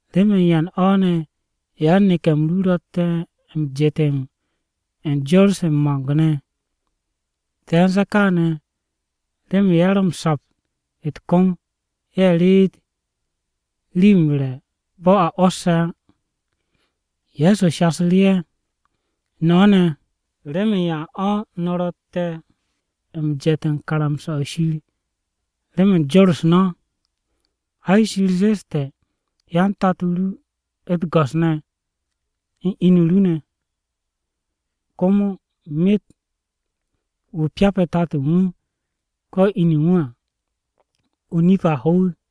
“¿Remen yan o̱ ne̱ yan-neke̱-m ru ro̱tte̱ m-jetem u̱n jor-se u̱n mo̱ng-ne̱? Te̱ u̱n ze̱e̱ kaane̱ remen ye̱ ro̱ m-sapt u̱t-kom ye̱ reet rii-yo m-re̱ bo̱ a o̱o̱s á.” Ye̱so shasu̱ru̱ ye̱, “No̱ ne̱, ¿remen yan o̱ no̱ ro̱tte̱ m-jet u̱n karamsa-o̱ Shir remen jor-u̱s no̱? Ai, Shir zeste̱, ‘Hyan tato ru u̱t-go̱s ne̱ u̱n inu ru ne̱,’ komo, ‘Myet wu̱ pyape̱ tato u̱n wu̱ ko̱ inu u̱n wu̱ à, o-nip a ho wu̱.’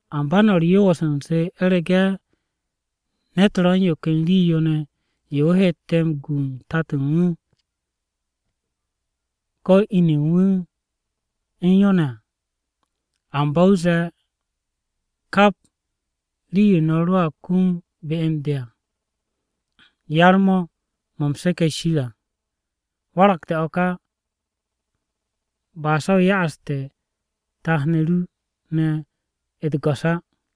Amba no̱ u̱r-yoos u̱nze u̱rege̱ ne̱t ro̱ u̱n yo ken rii-yo ne̱ yo wu̱ heete̱ m-gu u̱n tato u̱n wu̱ ko̱ inu u̱n ne̱ u̱n yo ne̱ à, amba wu̱a zee, ‘Kap rii-yo no̱ roa kum be u̱n de n-ga à, yar-mo̱ mo̱ u̱m seke̱ Shir à,’ waragte̱ o̱ ka, ba se̱ o ya'aste̱ tat-ne̱ ru ne̱ u̱t-go̱s á.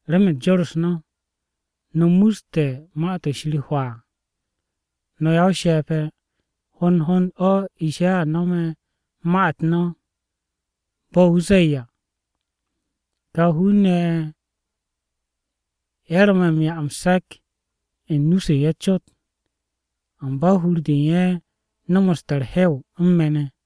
Remen jor-u̱s no̱, no̱ muste̱ Ma-to̱ Shir hwaa. No̱ ya-o-she̱pe̱! Hond hond o̱ Ishaya no̱me̱ ma-u̱t no̱ bo̱ wu̱ zee à, “ ‘Ká hun-ne̱ ye̱ ro̱ me̱ m-'ya m-se̱k u̱n nu-se u̱n ye̱ cot, Amba hur-de u̱n ye̱ nomoste̱ u̱r-hew u̱n me̱ ne̱.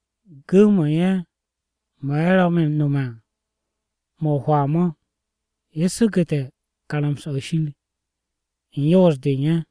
Gu̱w-mo̱ u̱n ye̱ mo̱ ye̱ ro̱ me̱ m-nome̱ à, mo̱ o-hwaa mo̱, ye̱ su̱gu̱te̱ karamsa-o̱ Shir u̱n yoos-de u̱n ye̱.’”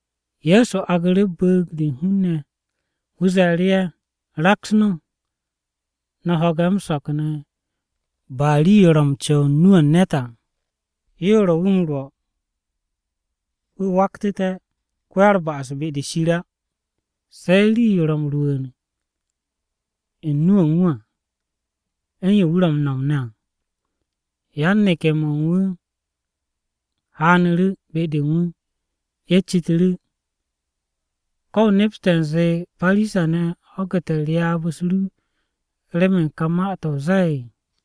Ye̱so aagu̱ru̱ bu̱u̱g-de u̱n hun-ne̱, wu̱ ze̱e̱ru̱ ye̱, “Raks no̱, no̱ ho̱ge̱ m-so̱k ne̱. Ba rii-yo ro̱ m-co̱w u̱n nu-o̱ u̱n ne̱t à, yo ro̱ wu̱ m-rwo̱ wu̱ waktu̱te̱ ko-ya-u̱r-ba'as be-de Shir á, se̱ rii-yo ro̱ m-rwu̱u̱n u̱n nu-o̱ u̱n wu̱ à, u̱n yo wu̱ ro̱ m-no̱m ne̱ à.” Yan-neke̱-mo̱ u̱n wu̱ haanu̱ru̱ be-de u̱n wu̱, ye̱ citu̱ru̱, “¿Ko̱ o nepste̱ u̱nze Parisa-ne̱ ho̱gu̱te̱ ryaab-u̱s ru remen kà ma-to̱ o zee?”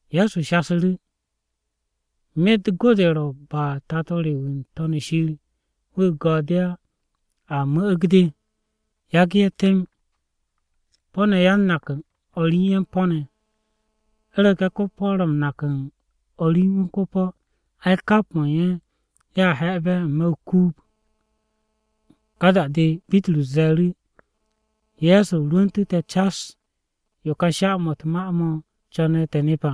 Ye̱so shasu̱ru̱, “Myet go-de ro̱ ba Tato re wu̱ n-To̱n shir wu̱ go de á, a mu̱'u̱g de. Yagu̱ ye̱ temb. Po̱-ne̱ yan-nak u̱n o̱r u̱n ye̱ po̱-ne̱. U̱rege̱ ko-po̱ ro̱ m-nak u̱n o̱r u̱n wu̱ ko-po̱, ai, kap mo̱ u̱n ye̱ ye̱a he̱'e̱be̱ n-me̱ o-kuub.” Ka da-de, Bitrus ze̱e̱ru̱, “Ye̱so, rwu̱ntu̱ te̱ cas yo ká sha-mo̱ u̱t-ma mo̱ co̱ne̱ te̱ nep à.”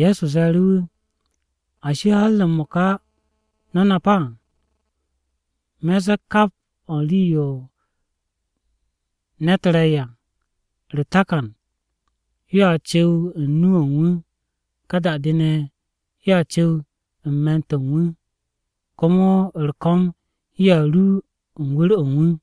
Ye̱so ze̱e̱ru̱ wu̱, “¿Ashi, har m-mo̱ka no̱ nap á? Me̱ m-ze̱e̱ kap o̱ u̱n rii-yo ne̱t re̱ à, u̱r-takan yoa cu̱w u̱n nu-o̱ u̱n wu̱, ká da-de ne̱ yoa cu̱w u̱n me̱n-to̱ u̱n wu̱, komo u̱r-ko̱m yoa ru u̱n wu̱r-o̱ u̱n wu̱.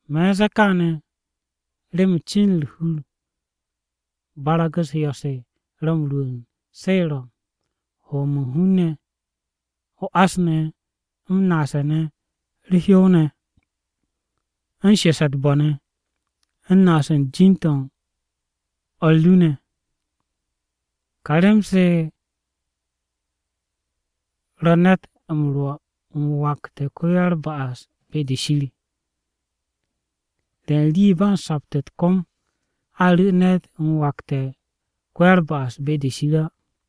Me̱ u̱n ze̱e̱ kaane̱ remen cin u̱r-hur barag-u̱s yo̱-se ro̱ m-rwu̱u̱n. Se ro̱, ho-m u̱n hun-ne̱, o-ás ne̱, m-naase̱ ne̱, u̱r-hyow ne̱, u̱n shese̱ u̱t-bo̱ ne̱, u̱n naas u̱n jin-u̱t o̱r ru ne̱. Se kà rem-se ro̱ ne̱t m-rwo̱ m-wakte̱ ko-ya-u̱r-ba'as be-de Shir. Re̱ u̱n rii ba u̱n sapt u̱t-kom a ru̱ ne̱t m-wakte̱ ko-ya-u̱r-ba'as be-de Shir á.”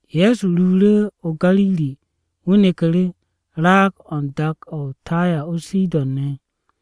Ye̱so ruuru̱ o-Gariri wu̱ neku̱ru̱ raag-o̱ u̱n dak-to̱ o-Taya o-Sidon ne̱,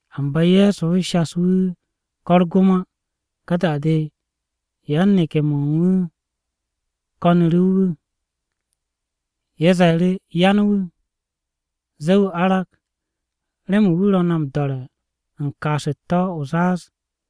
Amba Ye̱so shas wu̱ ko̱ u̱r-gom á. Ka da-de yan-neke̱-mo̱ u̱n wu̱ ko̱nu̱ru̱ wu̱, ye̱ ze̱e̱ru̱, “Yan wu̱! Zee wu̱ arag. Remen wu̱ ro̱ na m-do̱re̱ u̱n kaas u̱t-tó̱ o-zaaz!”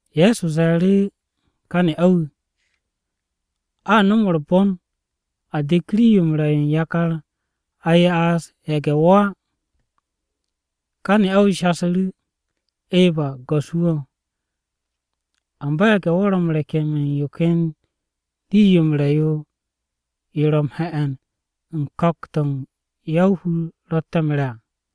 Ye̱so ze̱e̱ru̱ ká ne'a-wu̱, “A nom u̱r-bon a de̱k rii-yo m-re̱ yo u̱n yakar a ya'as ye̱ge̱-wo̱ á.” Ká ne'a-wu̱ shasu̱ru̱, “Eba, Go̱s-wu̱ o, amba ye̱ge̱-wo̱ ro̱ m-rekem u̱n yo ken rii-yo m-re̱ yo ro̱ m-he̱'e̱n u̱n ko̱k-to̱ ya-o-hur ro̱tte̱ m-re̱ à.”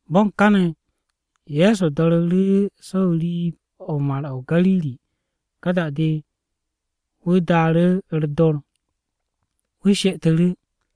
Bo̱n káne̱, Ye̱so do̱ru̱ru̱ so̱ n-riib Mar-o̱ o-Gariri. Ka da-de wu̱ daaru̱ u̱r-dor, wu̱ she'etu̱ru̱.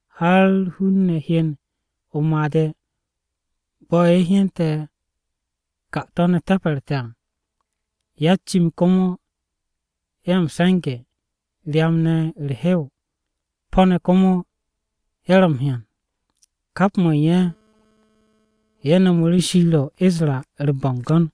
Har hun-ne̱ hyen o-made̱ bo̱ ye̱ hyane̱ 'kato̱-ne̱ te̱pe̱rte̱ à, ya-u̱t-cim komo ye̱ m-se̱nge̱, ryam-ne̱ u̱r-hew, po̱-ne̱ komo ye̱ ro̱ o-hyan. Kap mo̱ u̱n ye̱, ye̱ nomu̱ru̱ Shir o̱ o-Isra u̱r-bo̱ngo̱n.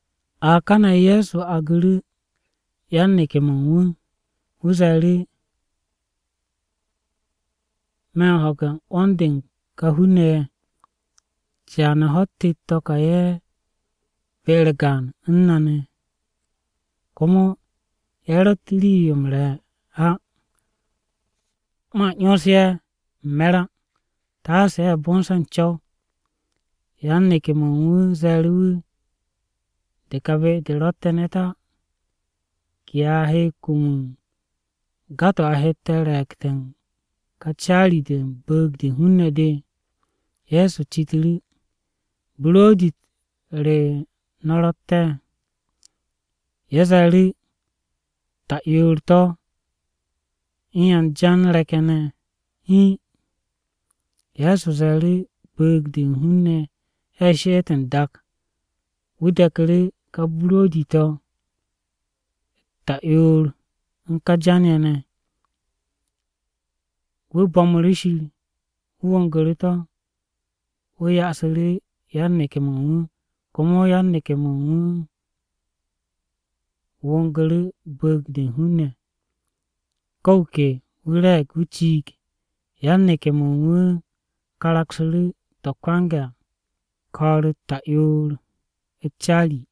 A kane̱ Ye̱so aagu̱ru̱ yan-neke̱-mo̱ u̱n wu̱, wu̱ ze̱e̱ru̱, “Me̱ m-ho̱ge̱ 'wo̱n-de u̱n kà hun-ne̱ ye̱. Caane̱ ho̱-u̱t tet-to̱ ka ye̱ be-u̱r gaan u̱n me̱ ne̱, komo ye̱ ro̱tt rii-yo m-re̱ á. Man 'yons ye̱ m-me̱r á, taase ye̱ bonse̱ u̱n co̱w.” Yan-neke̱-mo̱ u̱n wu̱ ze̱e̱ru̱ wu̱, “De kà be-de ro̱tte̱ ne̱t á, ¿ke a he kum u̱n ga-to̱ a hette̱ re̱e̱gte̱ u̱n de kà caari-de u̱n bu̱u̱g-de u̱n hun-ne̱ de?” Ye̱so citu̱ru̱, “¿Buro̱di-u̱t re no̱ ro̱tte̱?” Ye̱ ze̱e̱ru̱, “Ta'yoor-to̱ u̱n yan jan re̱k-ye̱ ne̱ hiin.” Ye̱so ze̱e̱ru̱ bu̱u̱g-de u̱n hun-ne̱ ye̱ she'ete̱ n-dak. Wu̱ de̱ku̱ru̱ ká buro̱di-to̱ ta'yoor-to̱ u̱n ká jan-ye̱ ne̱. Wu̱ bo̱mu̱ru̱ Shir, wu̱ wo̱ngu̱ru̱ to̱. Wu̱ ya'asu̱ru̱ yan-neke̱-mo̱ u̱n wu̱. Komo yan-neke̱-mo̱ u̱n wu̱ wo̱ngu̱ru̱ bu̱u̱g-de u̱n hun-ne̱. Ko̱ wu̱ ke wu̱ re̱e̱g wu̱ ciig. Yan-neke̱-mo̱ u̱n wu̱ karaksu̱ru̱ to̱ kwange̱ à, ko̱o̱r-u̱t ta'yoor u̱t-caari.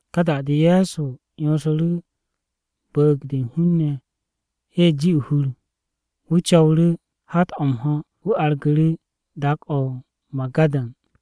Ka da-de Ye̱so 'yonsu̱ru̱ bu̱u̱g-de u̱n hun-ne̱ ye̱ ji o-hur. Wu̱ co̱wu̱ru̱ hat-o̱ m-ho̱ wu̱ argu̱ru̱ dak-o̱ o-Magadan.